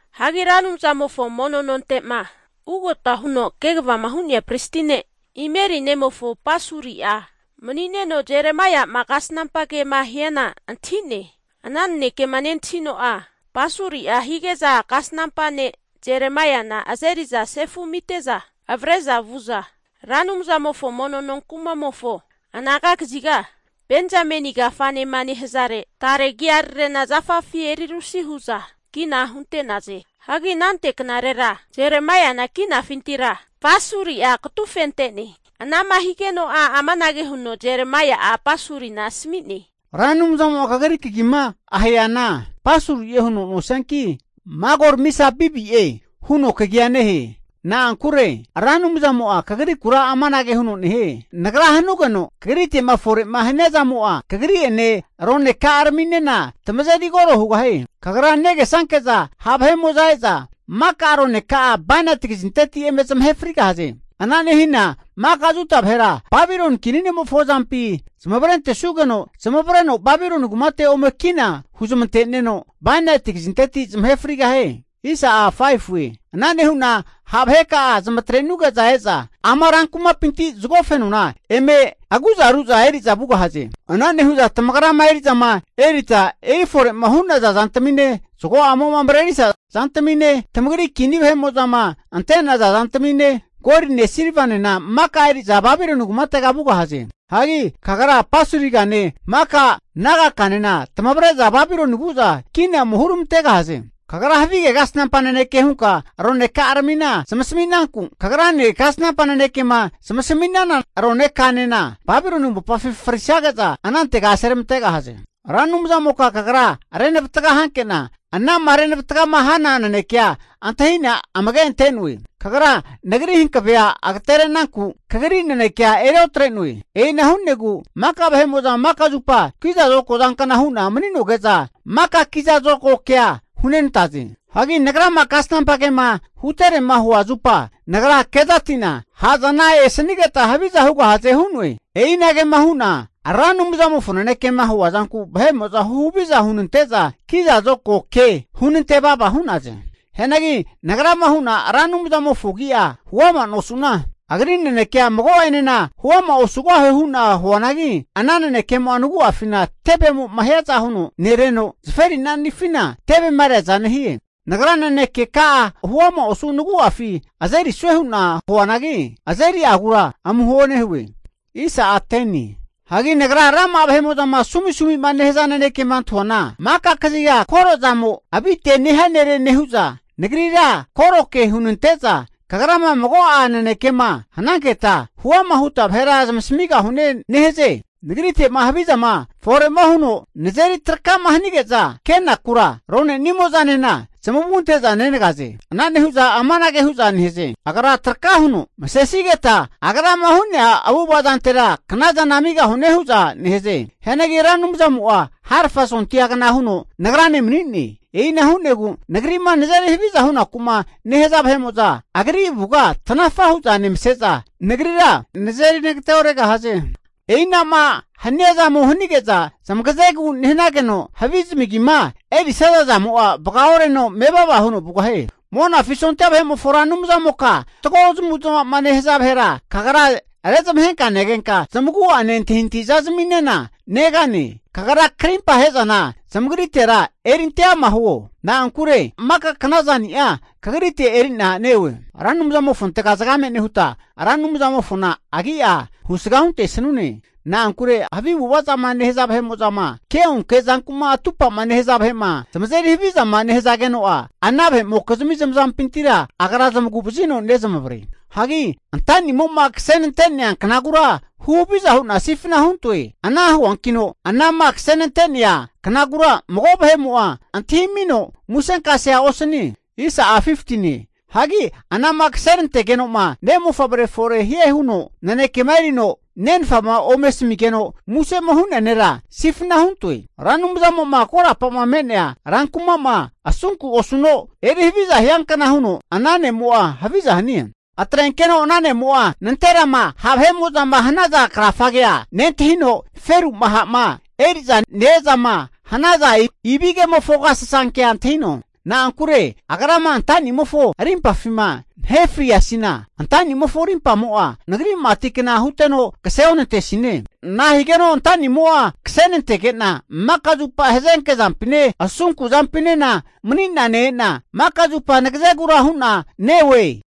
Hagi Ra Anumzamofo mono nonte'ma ugota huno kegavama hu'nea pristi ne' Imeri nemofo Pasuri'a, mani'neno Jeremaiama kasnampa kema hiana antahi'ne. Ana nanekema nentahino'a Pasuri'a hige'za kasnampa ne' Jeremaiana azeri'za sefu amite'za avre'za vu'za, Ra Anumzamofo mono nonkumamofo anaga kaziga Benzameni kafanema nehazare tare agiararena zafafi eri rusi hu'za kina hunte'naze. Hagi anante knarera Jeremaiana kinafintira Pasuri'a katufente'ne. Ana'ma nehigeno'a amanage huno Jeremaia'a Pasurina asami'ne. Ra Anumzamo'ma kagri kagima aheana Pasuri'e huno nosianki, Magor-Misabibie huno kagia nehe. Na'ankure Ra Anumzamo'a kagrikura amanage huno nehie. Nagra hanugeno kagrite'ma fore'ma hania zamo'a kagri'ene roneka'araminena tamazeri koro hugahie. Kagra negesanke'za ha' vahe'mo'za e'za maka roneka'a bainati kazinteti eme zamahe frigahaze. Ana nehina maka Juda vahera Babiloni kini ne'mofo azampi zamavarentesugeno zamavareno Babiloni kumate ome kina huzamante'neno, bainati kazinteti zamahe frigahie. Ana nehu'na ha' vaheka'a zamatre'nuge'za e'za ama ran kumapinti zago fenona eme ha' hu'za eri'za vugahaze. Ana nehu'za tamagrama eri'zama erita eri fore'ma hu'naza zantamine, zago'amo marerisa zantamine, tamagri kini vahe'mo'zama ante'naza zantamine, goline silvanena maka eri'za Babiloni kumatega vugahaze. Hagi kagra Pasurigane maka nagakanena tamavre'za Babiloni vu'za kina ome huramantegahaze. Kagra havige kasnampa naneke hunka roneka'aramina zamasami'nanku, kagrane kasnampa nanekema zamasami'nana ronekanena Babiloni mopafi frisage'za anantega aseramantegahaze. Ra Anumzamoka Kagra renavatga hanke'na, anama renavatgama hana naneke antahi'na amage ante'noe. Kagra nagri hankavea agatere'nanku kagri nanekea eri otre'noe. E'ina hu'negu maka vahe'mo'za maka zupa kiza zokago zankna hu'na mani'noge'za maka vahe'mo'za kiza zokago kea hunenantaze. Hagi nagrama kasnampa kema huterema hua zupa nagra kezati'na, ha' zana esanigeta haviza hugahaze hu'noe. E'inagema hu'na Ra Anumzamofo nanekema hua zanku vahe'mo'za huhaviza hunante'za kiza zokago ke hunante vava hu'naze. Hianagi nagrama hu'na, Ra Anumzamofo agi'a huama nosu'na, agri nanekea mago'enena huama osugahue hu'na huanagi, ana nanekemo'a nagu'afina tevemo'ma hiaza huno nereno, zaferinanifina tevema reaza nehie. Nagra nanekeka'a huama osu nagu'afi azerisue hu'na huanagi, azeri'agura amuho nehue. Hagi nagra rama'a vahe'mo'zama sumisumima nehaza nanekema antahuana, maka kaziga koro'zamo avite'ne nehia nere nehu'za, nagrira koroke hunante'za, kagrama mago'a nanekema hananketa, huama huta vahera zamasamigahune nehaze. Nagrite'ma havi zama fore'ma huno nazeri traka'ma hanige'za kenakura, rone'nimo'zanena zamavu ante'za nenagaze. Ana nehu'za amanage hu'za nehaze. Agra'a traka huno masesigeta, agrama hu'nea avu'ava zantera knazana amigahune hu'za nehaze. Hianagi Ra Anumzamo'a harfa sondia kna huno nagrane mani'ne. E'ina hu'negu nagri'ma nazeri haviza hunaku'ma nehaza vahe'mo'za Agri avuga tanafa hu'za nemase'za nagrira nazeri nagate'oregahaze. E'ina'ma hania zamo hanige'za zamagazegu nehanageno, havi zamagima erisaza zamo'a vagaoreno mevava huno vugahie. Monafi sondia vahe'mofo Ra Anumzamoka fatgo zamavu'zmavama nehaza vahera kagra rezmahenka negenka, zamagu'ane antahintahi zazaminena negane. Kagra krimpa ahe'zana zamagritera erinte ama huo. Na'ankure maka knazani'a kagrite eri'na neoe. Ra Anumzamofontega zagame nehuta, Ra Anumzamofona Agi'a husga huntesanune. Na'ankure havi avu'ava zama nehaza vahe'mo'zama, ke'onke zanku'ma atupa'ma nehaza vahe'ma zamazeri havizama nehazageno'a, ana vahe'mokizmi zamazampintira Agra zamagu'vazino nezamavare. Hagi antanimo'ma kasenante'nea knagura huhaviza hu'na sifna huntoe. Ana huankino anama kasenante'nea knagura mago vahe'mo'a antahimino musenkasea osanie. Hagi anama kasenantegeno'ma, ne' mofavre fore hia huno nanekema erino nenfama eme asamigeno musema hu'nea nera, sifna huntoe. Ra Anumzamo'ma korapa'ma me'nea rankuma'ma asunku osuno eri haviza hiankna huno ana ne'mo'a haviza hanie. Atrenkeno ana nemo'a nanterama ha' vahe'mo'zama hanaza krafagea nentahino, feru'ma ha'ma eri'za ne-ezama hanaza ibigemofo agasasankea antahino. Na'ankure Ra Anumzamo'a antanimofo arimpafima nahe friasina, antanimofo arimpamo'a nagri mati kna huteno kase onantesine. Nahigeno antanimo'a kasenante'nege'na, maka zupa hazenke zampine asunku zampinena mani'na ne-e'na, maka zupa nagazegura hu'na neoe.